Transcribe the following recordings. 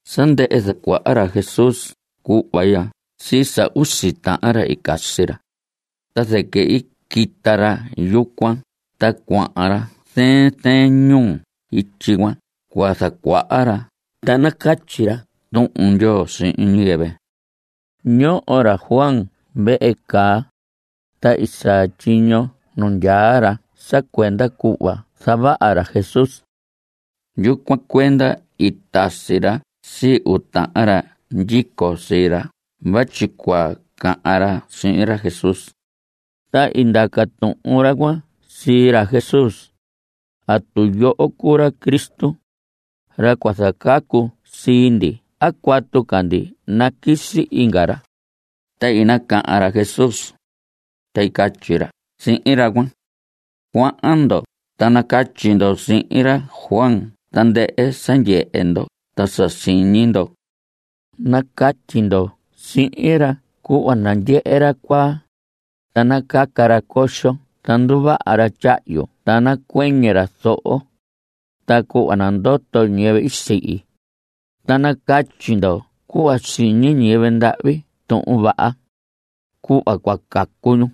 Sa ndɨhɨ zacuaha ra Jesús cuhva ya sii sa usi uu tahan ra i casi ra, ta zɨquɨ i quita ra yucuan ta cuahan ra zɨɨn zɨɨn ñuu ityi cuan cua zacuaha ra ta nacatyi ra Tuhun Ndyoo sihin ñiyɨvɨ. Ñoho ra Juan vehe caa, ta i saa tyiño nu ndyaa ra sa cuenda cuhva zavaha ra Jesús. Yucuan cuenda i tasi ra sii uu tahan ra ndyico sii ra vatyi cua cahan ra sihin ra Jesús. Ta i ndaca tuhun ra cuan sii ra Jesús: ¿Atu yoho cuu ra Cristo, ra cua zacacu sii ndi a cuatu ca ndi naquisi inga ra? Ta i nacahan ra Jesús, ta i catyi ra sihin ra cuan: Cuahan ndo ta nacatyi ndo sihin ra Juan tandɨhɨ sa i ndyehe ndo ta sa siñi ndo. Nacatyi ndo sihin ra cuhva nandyehe ra cuaa, ta nacaca ra coxo ta nduvaha ra tyahyu ta nacuɨñɨ ra zoho, ta cuhva nandoto ñiyɨvɨ i sihi. Ta nacatyi ndo cuhva siñi ñiyɨvɨ ndahvi Tuhun Vaha, cuhva cua cacu ñu.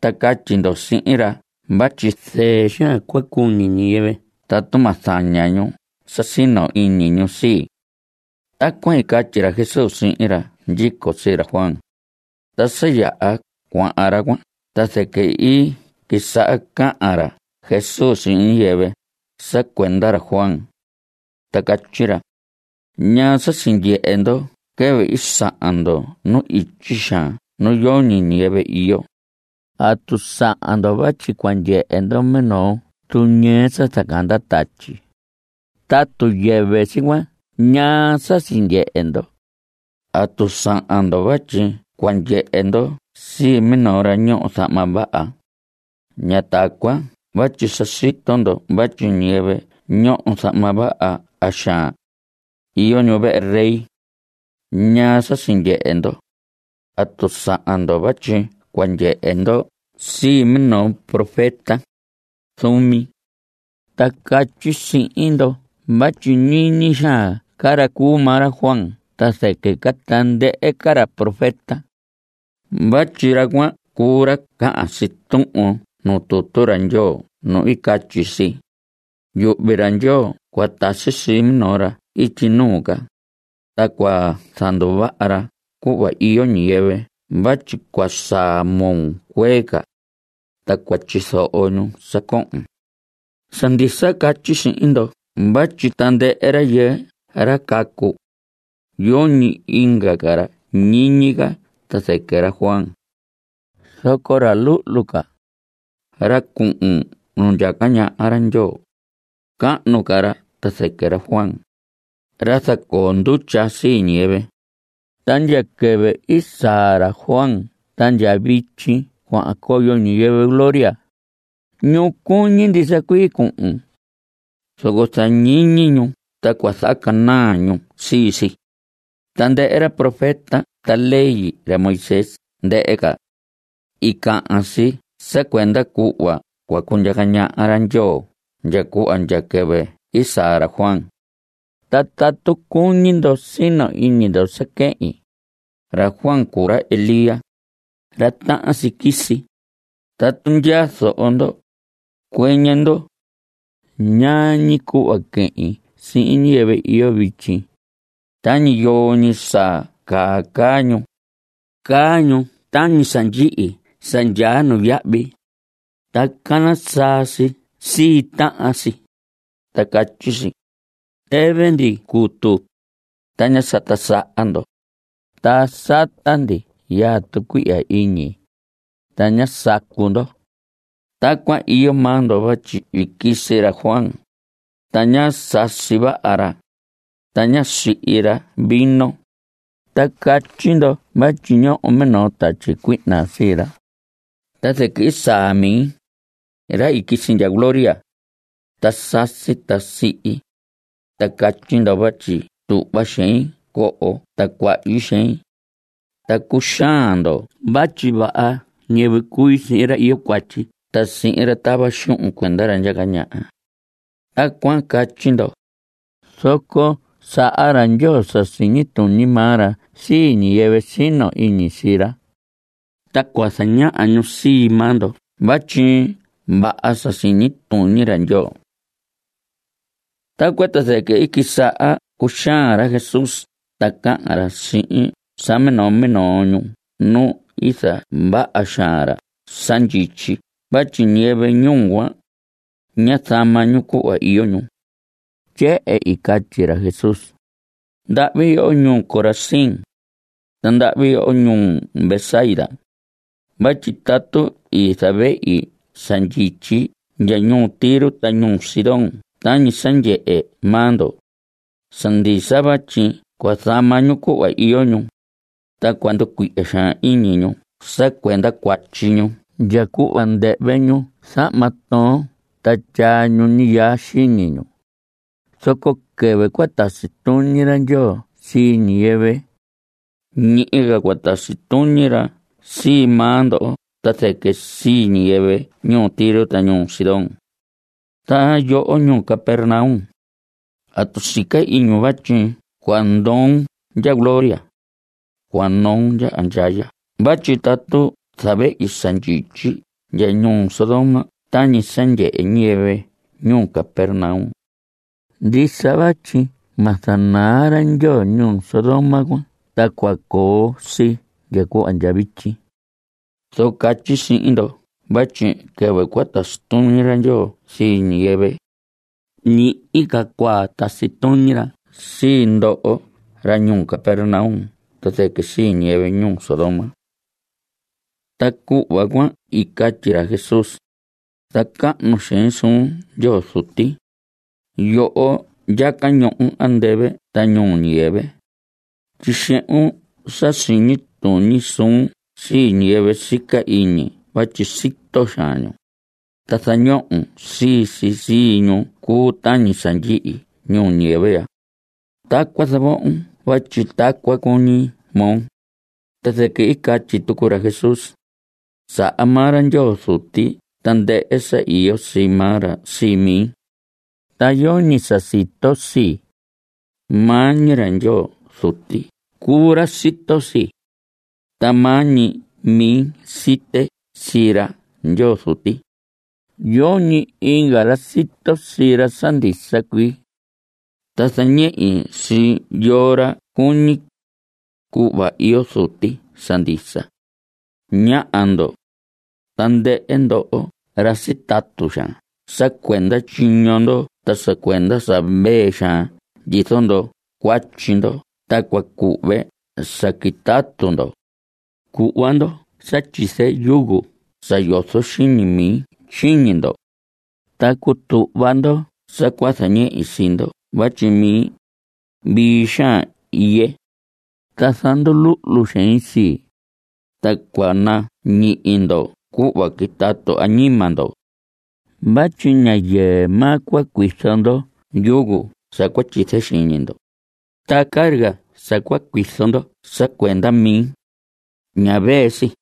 Ta catyi ndo sihin ra vatyi zɨɨ xaan cua cuñi ñiyɨvɨ tatu ma zaña ñu sa sino iñi ñu sii. Tacuan i catyi ra Jesús sihin ra ndyico sii ra Juan. Ta sa yaha cuahan ra cuan ta zɨquɨ i quisaha cahan ra Jesús sihin ñiyɨvɨ sa cuenda ra Juan, ta catyi ra: ¿Ñaa sa sindyehe ndo quɨvɨ i sahan ndo nu ityi xaan nu yoñi ñiyɨvɨ iyo? ¿Atu sahan ndo vatyi cua ndyehe ndo minoo tuñɨɨ sa zacanda tatyi? Tatu yɨvɨ si cuan ¿ñaa sa sindyehe ndo? ¿Atu sahan ndo vatyi cua ndyehe ndo sii minoo ra ñoho zahma vaha? Ña tacuan vatyi sa sito ndo vatyi ñiyɨvɨ ñoho zahma vaha xaan, iyo ñu vehe rey. ¿Ñaa sa sindyehe ndo? ¿Atu sahan ndo vatyi cua ndyehe ndo sii minoo profeta? Zuumi. Ta catyi sihin ndo vatyi ñiñi xaan ca ra cuu maa ra Juan ta zɨquɨ ca tandɨhɨ ca ra profeta. Vatyi ra cuan cuu ra cahan si tuhun nuu tutu ra Ndyoo nu catyi si: “Yuhvi ra Ndyoo cua tasi sii minoo ra ityi nuu ca, ta cua zanduvaha ra cuhva iyo ñiyɨvɨ vatyi cua saa moo cuee ca, ta cua tyizoho ñu sa cohon.” Sa ndisa catyi sihin ndo vatyi tandɨhɨ rayɨɨ ra cacu, yoñi inga ca ra ñiñi ca ta zɨquɨ ra Juan. Zoco ra luhlu ca, ra cuhun nu ndyaca ñaha ra Ndyoo, cahnu ca ra ta zɨquɨ ra Juan, ra zacoo ndutya sii ñiyɨvɨ. Ta ndya quɨvɨ i saa ra Juan ta ndya vityi cuahan coyo ñiyɨvɨ gloria, ñu cuñi ndisa cuii cuhun. Zoco zañihi ñu ta cua zahacanaa ñu sii si. Tandɨhɨ ra profeta ta ley ra Moisés ndɨhɨ ca, i cahan si sa cuenda cuhva cua cundyaca ñaha ra Ndyoo ndya cuhva ndya quɨvɨ i saa ra Juan. Ta tatu cuñi ndo sino iñi ndo sa quehin, ra Juan cuu ra Elías, ra tahan si quisi. Tatu ndyaa zoho ndo, cuɨñɨ ndo. ¿Ñaa ñi cuhva quehin sihin ñiyɨvɨ iyo vityi? ¿Tañi yoo ñi sa caa caa ñu? Caa ñu tañi sa ndyihi sa ndyaa nuyahvi, ta cana saa si sii tahan si, ta catyi si: “Tɨvɨ ndi cutu, ta ñá sata saha ndo. Ta sata ndi yaa tucuihya iñi, ta ñá sacu ndo.” Tacuan iyo maa ndo vatyi i quisi ra Juan, ta ñá sasi vaha ra, ta ñá sihi ra vino, ta catyi ndo vatyi ñoho minoo tatyi cuihna sii ra. Ta zɨquɨ i saa mi, ra i quisi ndya gloria. Ta sasi ta sihi, ta catyi ndo vatyi tuhva xein coho ta cuahyi xein. Ta cuxaan ndo vatyi vaha ñiyɨvɨ cui sihin ra iyo cuatyi ta sihin ra tava xuhun cuenda ra ndyaca ñaha. Tacuan catyi ndo, zoco saha ra Ndyoo sa siñi tuñi maa ra sii ñiyɨvɨ sino iñi sii ra. Ta cua zañaha ñu sii maa ndo vatyi vaha sa siñi tuñi ra Ndyoo. Tacuan ta zɨquɨ i quisaha cuxaan ra Jesús ta cahan ra sihin sa minoo minoo ñuu nu i zavaha xaan ra sa ndyityi vatyi ñiyɨvɨ ñuu cuan, ñá zama ñu cuhva iyo ñu. Tyehen i catyi ra Jesús: ¡Ndahvi yoho ñuu Corazín! ¡Ta ndahvi yoho ñuu Betsaida! Vatyi tatu i zavehi sa ndyityi ndya ñuu Tiro ta ñuu Sidón tañi sa ndyehe maa ndo, sa ndisa vatyi cua zama ñu cuhva iyo ñu, ta cua nducuihya xaan iñi ñu sa cuenda cuatyi ñu ndya cuhva ndɨhvɨ ñu zahma toon ta tyaa ñu ñiyaa xiñi ñu. Zoco quɨvɨ cua tasi tuñi ra Ndyoo sii ñiyɨvɨ, ñihi ca cua tasi tuñi ra sii maa ndo ta zɨquɨ sii ñiyɨvɨ ñuu Tiro ta ñuu Sidón cuan. Ta yoho ñuu Capernaum, ¿atu sica iñun vatyi cua ndoon ndya gloria? Cua noon ndya andyaya vatyi tatu i zavehi sa ndyityi ndya ñuu Sodoma tañi sa ndyehe ñiyɨvɨ ñuu Capernaum, ndisa vatyi ma zanaa ra Ndyoo ñuu Sodoma cuan ta cua coo si ndya cuhva ndya vityi. Zoco catyi sihin ndo vatyi quɨvɨ cua tasi tuñi ra Ndyoo sii ñiyɨvɨ, ñihi ca cua tasi tuñi ra sii ndoho ra ñuu Capernaum ta zɨquɨ sii ñiyɨvɨ ñuu Sodoma. Ta cuhva cuan i catyi ra Jesús: Zacahnu xein suun Ndyoo Zuti. Yoho ndyaca ñohon andɨvɨ ta ñuu ñiyɨvɨ. Tyixehun sa siñi tuñi suun sii ñiyɨvɨ sica iñi vatyi sito xaan ñu, ta zañohon sii si sii ñu cuu tañi sa ndyihi ñuu ñiyɨvɨ ya. Tacuan zavohon vatyi tacuan cuñi moo. Ta zɨquɨ i catyi tucu ra Jesús: Saha maa ra Ndyoo Zuti tandɨhɨ sa iyo sii maa ra sii mi. Ta yoñi sa sito sii. Maa ñi ra Ndyoo Zuti cuu ra sito sii. Ta maa ñi mi site sii ra Ndyoo Zuti. Yoñi inga ra sito sii ra sa ndisa cuii. Ta zañehi sii yoo ra cuñi, cuhva iyo Zuti sa ndisa. Ñáha ndo, tandɨhɨ ndoho ra sitatu xaan sa cuenda tyiño ndo ta sa cuenda sa vee xaan ndyizo ndo cuatyi ndo ta cua cuhve sa quitatu ndo. Cuhva ndo sa tyize yugo sa yozo xiñi mi xiñi ndo, ta cutuhva ndo sa cua zañehi sii ndo vatyi mi, vii xaan iye, ta zanduluhlu xein sii, ta cua nañihi ndo cuhva quitatu añima ndo. Vatyi ña yɨɨ maa cua cuizo ndo yugo sa cua tyize xiñi ndo, ta carga sa cua cuizo ndo sa cuenda mi, ña vee si.